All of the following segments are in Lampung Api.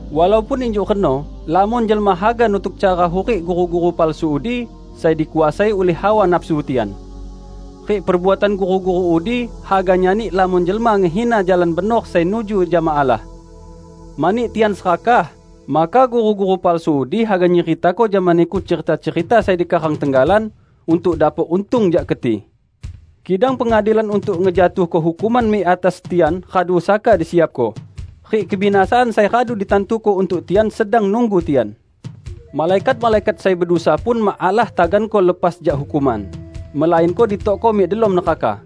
Walaupun injuk reno lamon jelma haga nutuk cara hurik guru-guru palsu udi sai dikuasai ulih hawa nafsu tian. Rik perbuatan guru-guru udi haga nyani lamon jelma ngehina Jalan Benor sai nuju jama Allah. Mani tian serakah, maka guru-guru palsu udi haga nyeritako jama niku cerita-cerita sai dikarang tenggalan untuk dapok untung jak keti. Kidang pengadilan untuk ngejatuhko hukuman mik atas tian radu saka disiapko, rik kebinasaan sai radu ditantuko untuk tian sedang nunggu tian. Malaikat-malaikat sai bedusa pun mak Allah taganko lepas jak hukuman, melainko ditokko mik delom neraka.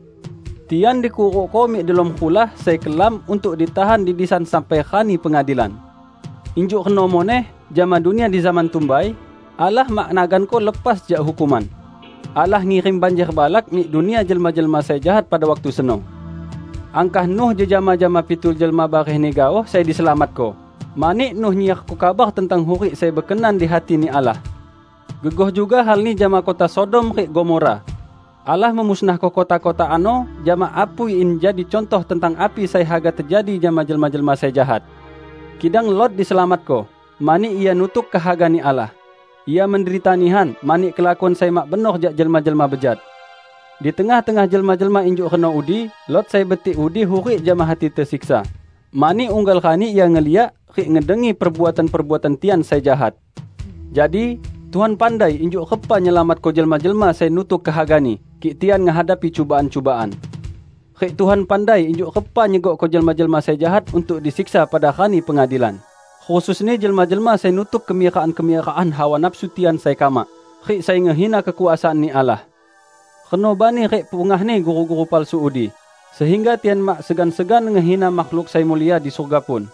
Tian dikurukko mik delom rulah sai kelam untuk ditahan di disan sampai Rani Pengadilan. Injuk reno muneh jama dunia di zaman tumbai, Allah mak naganko lepas jak hukuman. Allah ngirim banjer balak mik dunia jelma-jelma sai jahat pada waktu seno. Angkah Nuh jejama jama pitu jelma barehni gaoh sai diselamatko, mani Nuh nyiarko kabar tentang hurik sai bekenan di hati-Ni Allah. Gegoh juga halni jama kota Sodom rik Gomora: Allah memusnahko kota-kota ano jama apui in jadi cuntoh tentang api sai haga tejadi jama jelma-jelma sai jahat. Kidang Lot diselamatko, mani ia nutuk kehaga-Ni Allah; ia menderita nihan mani kelakuan sai mak benor jak jelma-jelma bejat. Di tengah-tengah jelma-jelma injuk reno udi Lot sai betik udi hurik jama hati tesiksa, mani unggal rani ia ngeliak rik ngedengi perbuatan-perbuatan tian sai jahat. Jadi, Tuhan pandai injuk repa nyelamatko jelma-jelma sai nutuk kehaga-Ni kik tian ngehadapi cubaan-cubaan. Rik Tuhan pandai injuk repa nyegokko jelma-jelma sai jahat untuk disiksa pada Rani Pengadilan, khususni jelma-jelma sai nutuk kemirakan-kemirakan hawa nafsu tian sai kamak rik sai ngehina kekuasaan-Ni Allah. Reno bani rik pungahni guru-guru palsu udi sehingga tian mak segan-segan ngehina makhluk sai mulia di surga pun!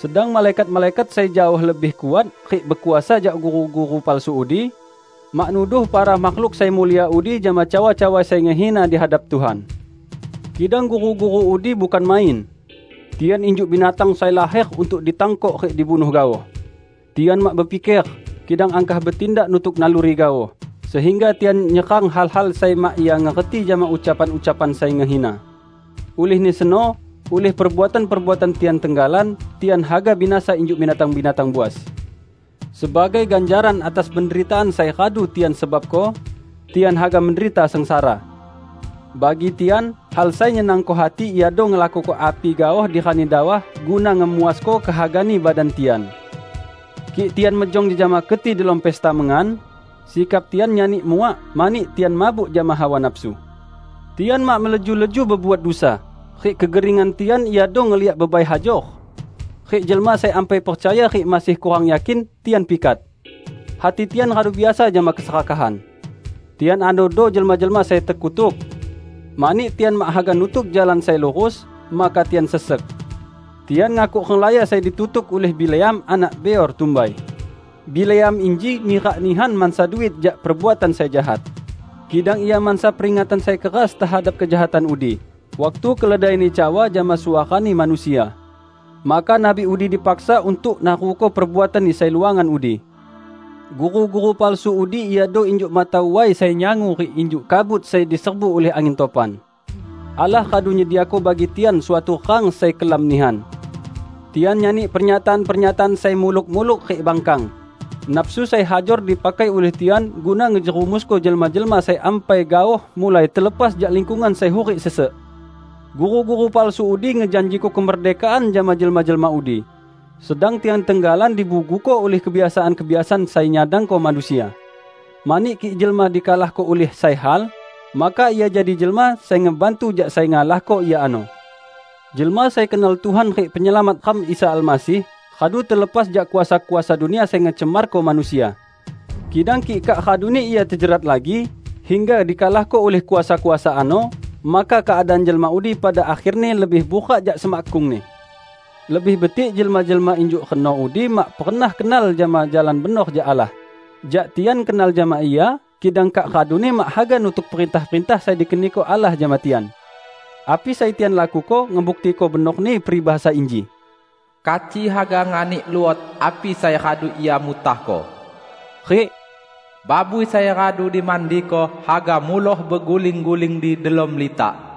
Sedang malaikat-malaikat sai jaoh lebih kuat rik bekuasa jak guru-guru palsu udi, mak nuduh para makhluk sai mulia udi jama cawa-cawa sai ngehina di hadap Tuhan. Kidang guru-guru udi, bukan main! Tian injuk binatang sai laher untuk ditangkok rik dibunuh gaoh. Tian mak bepiker, kidang angkah betindak nutuk naluri gaoh, sehingga tian nyerang hal-hal sai mak ia ngerti jama ucapan-ucapan sai ngehina. Ulihni seno ulih perbuatan-perbuatan tian tenggalan, tian haga binasa injuk binatang-binatang buas. Sebagai ganjaran atas penderitaan sai radu tian sebabko, tian haga menderita sengsara. Bagi tian, hal sai nyenangko hati iado ngelakuko api gaoh di rani dawah guna ngemuasko kehagani badan tian. Kik tian mejong jejama keti delom pesta mengan, sikap tian nyani muak mani tian mabuk jama hawa nafsu. Tian mak meleju-leju bebuat dusa, rik kegeringan tian iado ngeliak bebai hajor. Rik jelma sai ampai percaya rik masih kurang yakin tian pikat. Hati tian radu biasa jama keserakahan. Tian anodo jelma-jelma sai tekutuk. Mani tian mak haga nutuk jalan sai lurus, maka tian sesek. Tian ngakuk renglaya sai ditutuk ulih Bileam anak Beor tumbai. Bileam inji mirak nihan mansa duit jak perbuatan sai jahat. Kidang ia mansa peringatan sai keras tehadap kejahatan udi, waktu keledaini cawa jama suarani manusia. Maka nabi udi dipaksa untuk naruko perbuatanni sai luangan udi. Guru-guru palsu udi iado injuk mata way sai nyangu rik injuk kabut sai diserbu ulih angin topan. Allah radu nyediako bagi tian suatu rang sai kelam nihan. Tian nyani pernyataan-pernyataan sai muluk-muluk rik bangkang; nafsu sai hajor dipakai ulih tian guna ngejerumusko jelma-jelma sai ampai gaoh mulai telepas jak lingkungan sai hurik sesek. Guru-guru palsu udi ngejanjiko kemerdekaan jama jelma-jelma udi, sedang tian tenggalan dibuguko ulih kebiasaan-kebiasaan sai nyadangko manusia. Mani kik jelma dikalahko ulih sai hal, maka ia jadi jelma sai ngebantu jak sai ngalahko ia ano. Jelma sai kenal Tuhan rik Penyelamat ram Isa Almasih radu telepas jak kuasa-kuasa dunia sai ngecemarko manusia. Kidang kik kak raduni ia tejerat lagi hingga dikalahko ulih kuasa-kuasa ano, maka keadaan jelma udi pada akherni lebih burak jak semakkungni. Lebih betik jelma-jelma injuk reno udi mak pernah kenal jama jalan benor jak Allah, jak tian kenal jama ia, kidang kak raduni mak haga nutuk perintah-perintah sai dikeniko Allah jama tian. Api sai tian lakuko ngebuktiko benorni peribahasa inji, "Kaci haga nganik luot api sai radu ia mutahko," rik "Babui sai radu dimandiko haga muloh beguling-guling di delom litak."